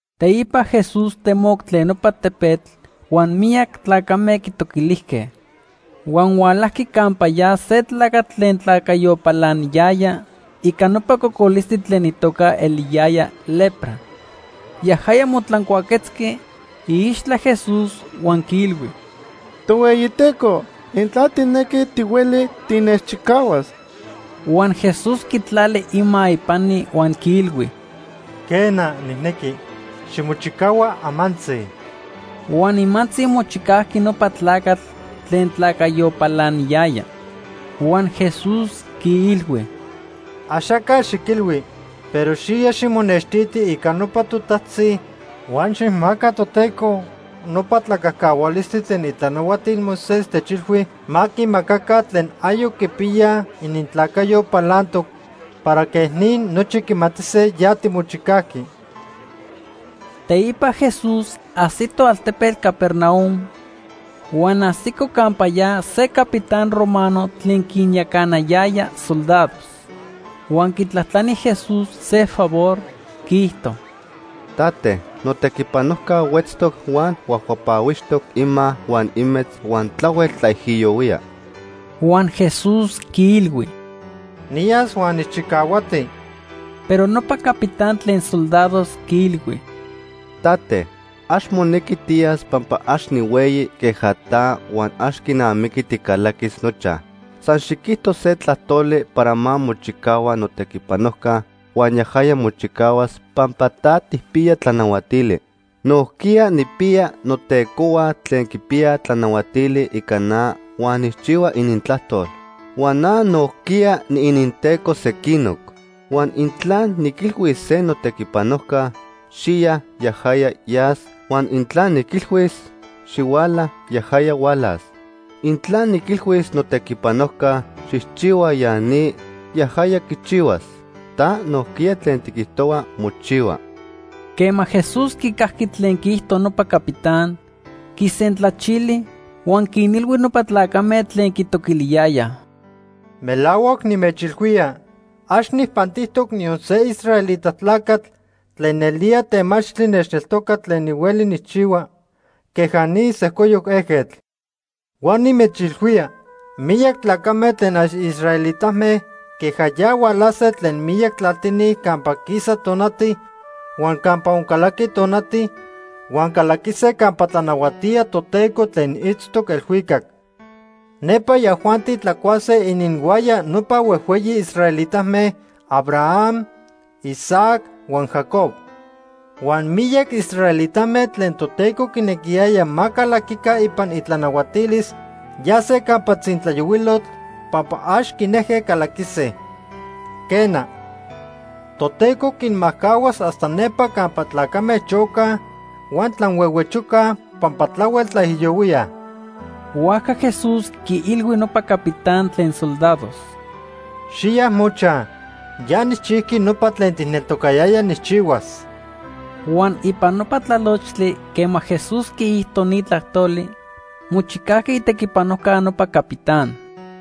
Teipa Jesús temoc tlen nopa tepetl huan miyac tlacame quitoquilijque. Huan hualajqui campa ya se tlacatl tlen tlacayo palaniyaya ica nopa cocolistli tlen itoca eliyaya lepra. Yajaya motlancuaquetzqui iixtla Jesús huan quiilhui: ―Tohueyiteco, intla tijnequi, tihueli tinechchicahuas. Huan Jesús quitlali ima ipani huan quiilhui: ―Quena, nijnequi. Ximochicahua amantzi. Huan nimantzi mochicajqui nopa tlacatl tlen tlacayo palaniyaya. Huan Jesús quiilhui: ―Axaca xiquilhui. Pero xiya ximonextiti ica nopa totajtzi huan xijmaca Toteco nopa tlacajcahualistli tlen itlanahuatil Moisés techilhui ma quimacaca tlen ayoc quipiyaj inintlacayo palantoc para quej ni nochi quimatise ya timochicajqui. Teipa Jesús ajsito altepetl Capernaum, huan ajsico campa ya se capitán romano tlen quinyacanayaya soldados. Huan quitlajtlani Jesús se favor, quiijto: ―Tate, notequipanojca huetztoc huan huajhuapahuixtoc ima huan imetz huan tlahuel tlaijiyohuía. Huan Jesús quiilhui: ―Niyas huan nijchicahuati. Pero nopa capitán tlen soldados quiilhui: ―Tate, ax monequi tiyas pampa ax nihueyi queja ta huan ax quinamiqui ticalaquis nochaj. San xiquijto se tlajtoli para ma mochicahua notequipanojca huan yajaya mochicahuas, pampa ta tijpiya tlanahuatili. Nojquiya nijpiya notecohua tlen quipiyaj tlanahuatili ica na huan nijchihua inintlajtol. Huan na nojquiya niininteco sequinoc. Huan intla niquilhuis se notequipanojca: ‘Xiya’, yajaya yas, huan intla niquilhuis: ‘Xihuala’, yajaya hualas. Intla niquilhuis notequipanojca: ‘Xijchihua ya ni’, yajaya quichihuas. Ta nojquiya tlen tiquijtohua, mochihua. Quema Jesús quicajqui tlen quiijto nopa capitán, quisentlachili, huan quinilhui nopa tlacame tlen quitoquiliyayaj: ―Melahuac nimechilhuía, ax nijpantijtoc niyon se israelita tlacatl tlen nelía temachtli nechneltoca tlen nihueli nijchihua queja ni sejcoyoc ejquetl. Huan nimechilhuía miyac tlacame tlen ax israelitame queja ya hualase tlen miyac tlaltini campa quisa tonati huan campa oncalaqui tonati huan calaquise campa tlanahuatía Toteco tlen itztoc elhuicac. Nepa yajuanti tlacuase ininhuaya nopa huejhueyi israelitame: Abraham, Isaac huan Jacob. Huan miyac israelitame tlen Toteco quinequiyaya ma calaquica ipan itlanahuatilis, yase campa tzintlayohuilotl pampa ax quinejque calaquise. Quena, Toteco quinmajcahuas hasta nepa campa tlacame chocaj huan tlanhuehuechocaj pampa tlahuel tlaijiyohuíaj. Huajca Jesús quiilhui nopa capitán tlen soldados: ―Xiya mochaj. Ya nijchijqui nopa tlen tijneltocayaya nijchihuas. Huan ipan nopa tlalochtli quema Jesús quiijto ni tlajtoli, mochicajqui itequipanojca nopa capitán.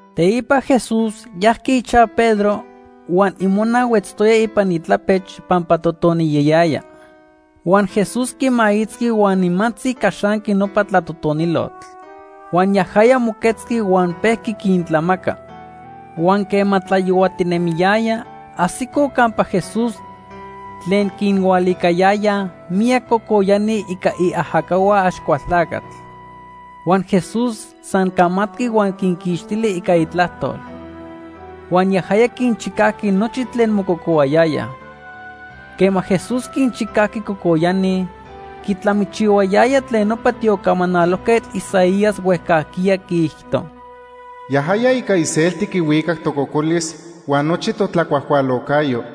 Teipa Jesús yajqui ichaj Pedro huan imona huetztoya ipan itlapech pampa totoniyayaya. Huan Jesús quimaitzqui huan nimantzi caxanqui nopa tlatotonilotl. Huan yajaya moquetzqui huan pejqui quintlamaca. Huan quema tlayohuatinemiyaya, ajsicoj campa Jesús tlen quinhualicayayaj miyac cocoyani ica iajacahua Axcualtlacatl. Huan Jesús san camatqui huan quinquixtili ica itlajtol. Huan yajaya quinchicajqui nochi tlen mococohuayayaj. Quema Jesús quinchicajqui cocoyani, quitlamichihuayaya tlen nopa tiocamanalojquetl Isaías huejcajquiya quiijto: “Yajaya ica iselti quihuicac tococolis huan nochi totlacuajcualocayo.”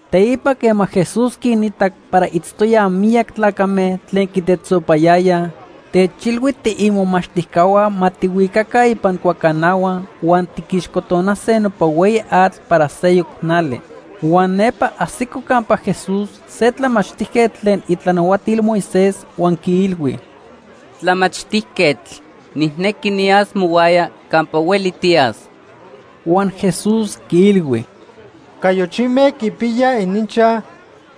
Teipa quema Jesús quinitac para itztoyaj miyac tlacame tlen quitetzopayayaj, techilhui tiimomachtijcahua ma tijhuicaca ipan cuacanahua huan tiquixcotonase nopa hueyi atl para seyoc nali. Huan nepa ajsico campa Jesús se tlamachtijquetl tlen itlanahuatil Moisés huan quiilhui: ―Tlamachtijquetl, nijnequi niyas mohuaya campa hueli tiyas. Huan Jesús quiilhui: ―Cayochime quipiyaj ininchaj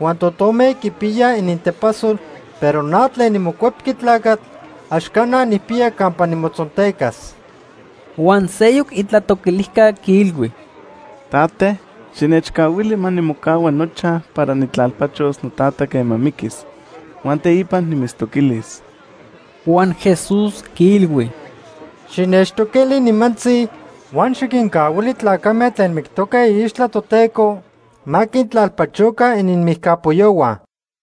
huan totome quipiyaj inintepasol, pero na tlen niMocuepqui Tlacatl ax cana nijpiya campa nimotzontecas. Huan seyoc itlatoquilijca quiilhui: ―Tate, xinechcahuili ma nimocahua nochaj para nijtlalpachos notata quema miquis, huan teipa nimitztoquilis. Huan Jesús quiilhui: ―Xinechtoquili nimantzi, huan xiquincahuili tlacame tlen mictoque iixtla Toteco ma quintlalpachoca ininmijcapoyohua.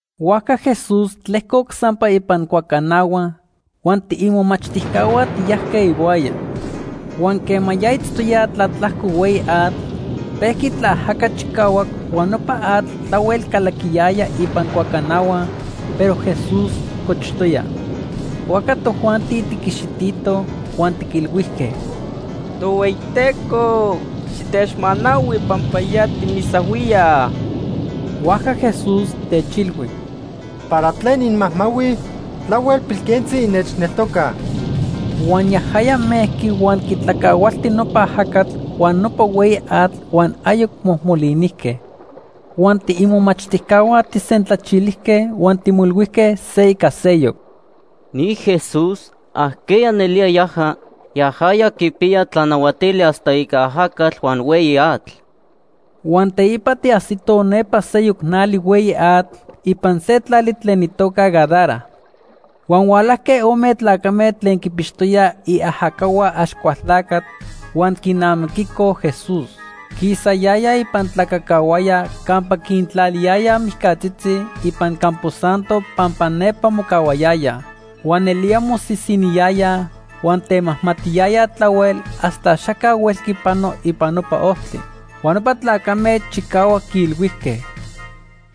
Huajca Jesús tlejcoc sampa ipan cuacanahua huan tiimomachtijcahua tiyajque ihuaya. Huan quema ya tiitztoyaj tlatlajco hueyi atl, pejqui tlaajaca chicahuac huan nopa atl tlahuel calaquiyaya ipan cuacanahua, pero Jesús cochtoya. Huajca tojuanti tiquixititoj huan tiquilhuijque: ―Tohueyiteco, xitechmanahui pampa ya timisahuíaj. Huajca Jesús techilhui: ―¿Para tlen inmajmahuij? Tlahuel pilquentzi innechneltocaj. Huan yajaya mejqui huan quitlacahualti nopa ajacatl huan nopa hueyi atl huan ayoc mojmolinijque. Huan tiimomachtijcahua tijsentlachilijque huan timoilhuijque se ica seyoc: ―Ni Jesús, ¿ajqueya nelía yaja? Yajaya quipiya tlanahuatili hasta ica ajacatl huan hueyi atl. Huan teipa tiajsitoj nepa seyoc nali hueyi atl ipan se tlali tlen itoca Gadara. Huan hualajque ome tlacame tlen quinpixtoyaj iajacahua Axcualtlacatl huan quinamiquicoj Jesús. Quisayayaj ipan tlacacahuaya campa quintlaliyayaj mijcatzitzi ipan campo santo pampa nepa mocahuayayaj. Huan nelía mosisiniyayaj huan temajmatiyayaj tlahuel hasta axaca huelqui panoj ipan nopa ojtli. Huan nopa tlacame chicahuac quiilhuijque: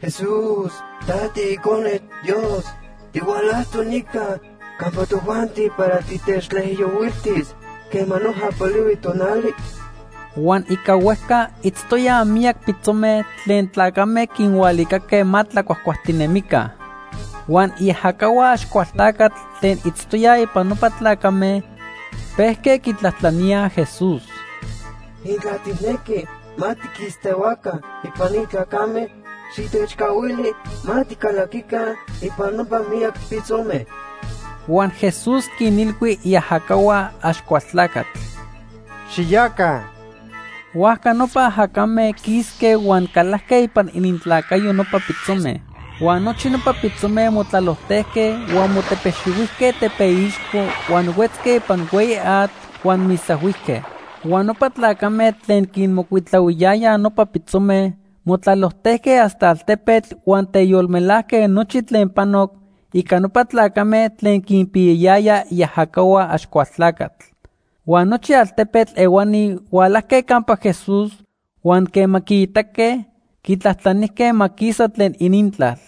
―Jesús, ta tiIcone Dios. ¿Tihualajtoc nica campa tojuanti para titechtlaijiyohuiltis quema noja polihui tonali? Huan ica huejca itztoyaj miyac pitzome tlen tlacame quinhualicaque ma tlacuajtinemica. Huan iajacahua Axcualtlacatl tlen itztoyaj ipan nopa tlacame pejque quitlajtlaníaj Jesús: ―Intla tijnequi ma tiquistehuaca ipan ni tlacame, xitechcahuili ma ticalaquica ipan nopa miyac pitzome. Huan Jesús quinilhui iajacahua Axcualtlacatl: ―Xiyaca. Huajca nopa ajacame quisque huan calajque ipan inintlacayo nopa pitzome. Huan nochi nopa pitzome motlalojtejque huan motepexihuijque tepeixco huan huetzque ipan hueyi atl huan misahuijque. Huan nopa tlacame tlen quinmocuitlahuiyayaj nopa pitzome motlalojtejque hasta altepetl huan teyolmelajque nochi tlen panoc ica nopa tlacame tlen quinpiyayaya iajacahua Axcualtlacatl. Huan nochi altepetl ehuani hualajque campa Jesús huan quema quiitaque, quitlajtlanijque ma quisa tlen inintlal.